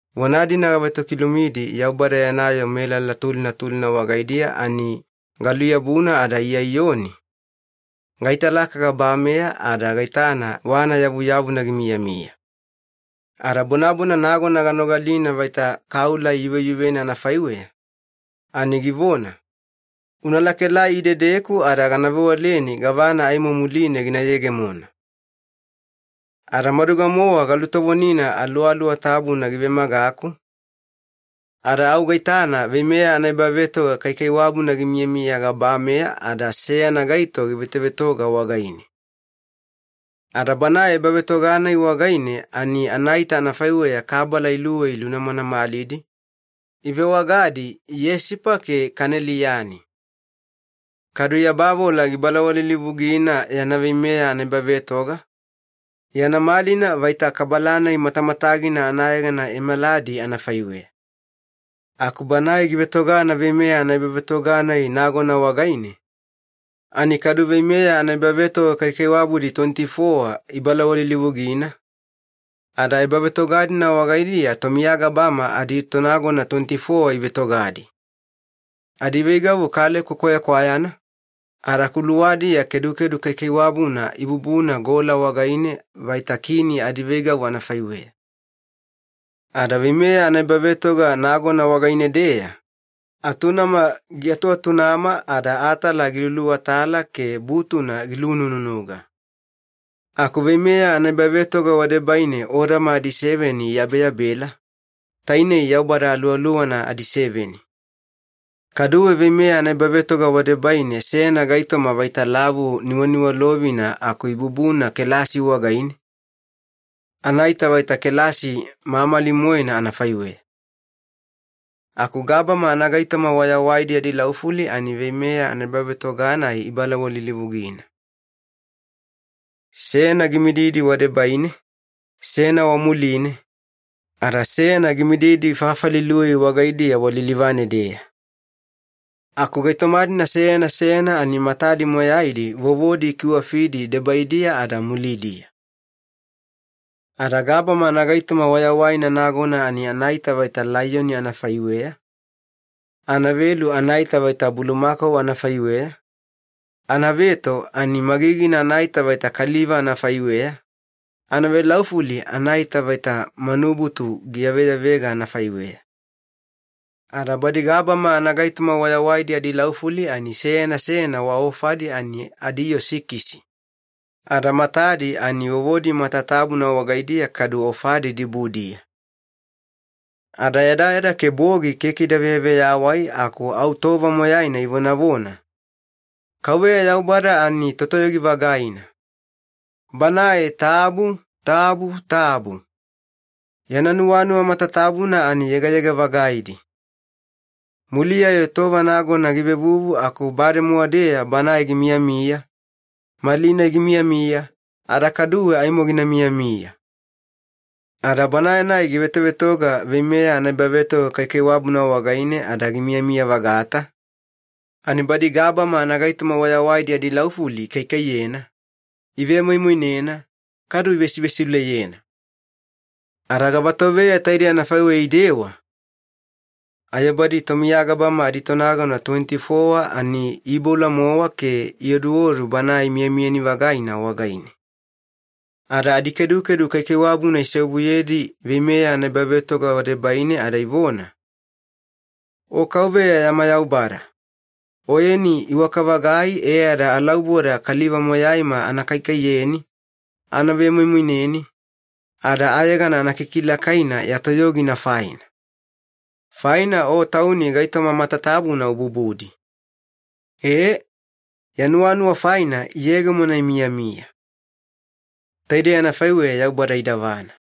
Vona-dina gavetokilumidi Yaubada yana yoo melala tulina tulina wagaidiya ani galuyabuna ada Iya Iyoni, gaitalaka gabameya ada gaitana wana yavuyavuna gimiyamiya. Ada bonabona nagona ganogalina vaita kaula iyuveyuvena anafaiweya, ani givona, “Una lakaelai idedeku ada gana vewaleni gavana aimo muline gina yegemona.” Ada maduga-mowa galutovonina Aluwaluwa Tabuna givemagaku, ada au gaitana veimeya anaebavetoga kaikaiwabuna gimiyamiya gabameya ada seyana gaito givetovetoga wagaine. Ada Banae ebavetoga-nai wagaine ani anaita anafaiweya kabala iluwei lunamanamalidi, ivewagadi yesipa ke kaneliyani. Kadu yabavola gibalawalilivugina yana veimeya anaebavetoga, yana malina vaita kabala-nai matamatagina anayegana emeladi anafaiweya. Aku Banae givetogana veimeya anaebavetoga-nai nagona wagaine, ani kadu veimeya anaebavetoga kaikaiwabudi tuweniti-fowa ibalawalilivugina, ada ebavetoga-dina wagaidiya tomiya gabama aditonagona tuweniti-fowa ivetogadi. Adiveigavu kaleko kwayakwayana, ada kuluwadiya kedukedu kaikaiwabuna ibubuna gola wagaine vaita kini adiveigavu anafaiweya. Ada veimeya anaebavetoga nagona wagaine-deya, atunama giatuatunama ada atala giluluatala ke butuna gilunununuga. Aku veimeya anaebavetoga wadebaine odama adiseveni iyabeyabela, tainei Yaubada Aluwaluwana adiseveni. Kaduwe veimeya anaebavetoga wadebaine seyana gaitoma vaita lavu niwaniwalovina aku ibubuna kelasi wagaine, anaita vaita kelasi mamali-moena anafaiweya. Aku gabama anagaitoma wayawaidi adilaufuli ani veimeya anaebavetoga-nai ibalawalilivugina. Seyana gimididi wadebaine, seyana wamuline, ada seyana gimididi fafali iluwei wagaidiya walilivane-deya. Aku gaitoma-dina seyana seyana ani matadi moyaidi vovodi ikiwafidi debaidiya ada mulidiya. Ada gabama anagaitoma wayawaina nagona ani anaita vaita laiyoni anafaiweya, anavelu anaita vaita bulumakau anafaiweya, anaveto ani magigina anaita vaita kaliva anafaiweya, anavelaufuli anaita vaita manubutu giyaveyavega anafaiweya. Ada badi gabama anagaitoma wayawaidi adilaufuli ani seyana seyana wa ofadi ani adiyoo sikisi, ada matadi ani vovodi matatabuna wagaidiya kadu ofadi dibudiya. Ada yadayada ke bogi keke ida veyaveyawai aku au tova moyaina ivonavona, “Kauveya Yaubada ani Totoyogi-vagaina. Banae tabu tabu tabu. Yana nuwanuwa matatabuna ani yegayega-vagaidi. Muliya-yo tova nagona givevuvu aku bademowa-deya Banae gimiyamiya, malinai gimiyamiya, ada kaduwe aimo gina miyamiya.” Ada Banae-nai givetovetoga veimeya anaebavetoga kaikaiwabuna wagaine ada gimiyamiya-vagata, ani badi gabama anagaitoma wayawaidi adilaufuli ikaikaiyena, ivemoimoinena, kadu ivesivesiuleyena. Ada gavatoveya taidei anafaiweya idewa, ayo badi tomiya gabama aditonagona tuweniti-fowa ani iiboula-mowa ke ioduodu Banae miyamiyani-vagaina wagaine. Ada adikedukedu kaikaiwabuna iseobuyedi veimeya anaebavetoga wadebaine ada ivona, “O Kauveya yama Yaubada, Oyeni iwaka-vagai e ada alauboda kaliva moyaima ana kaikaiyeni, ana vemoimoineni, ada ayegana ana kikilakaina ya toyogina faina. Faina O Tauni gaitoma matatabuna ububudi. Ee, ya nuwanuwa faina iyegemona imiyamiya.” Taidei anafaiweya Yaubada idavana.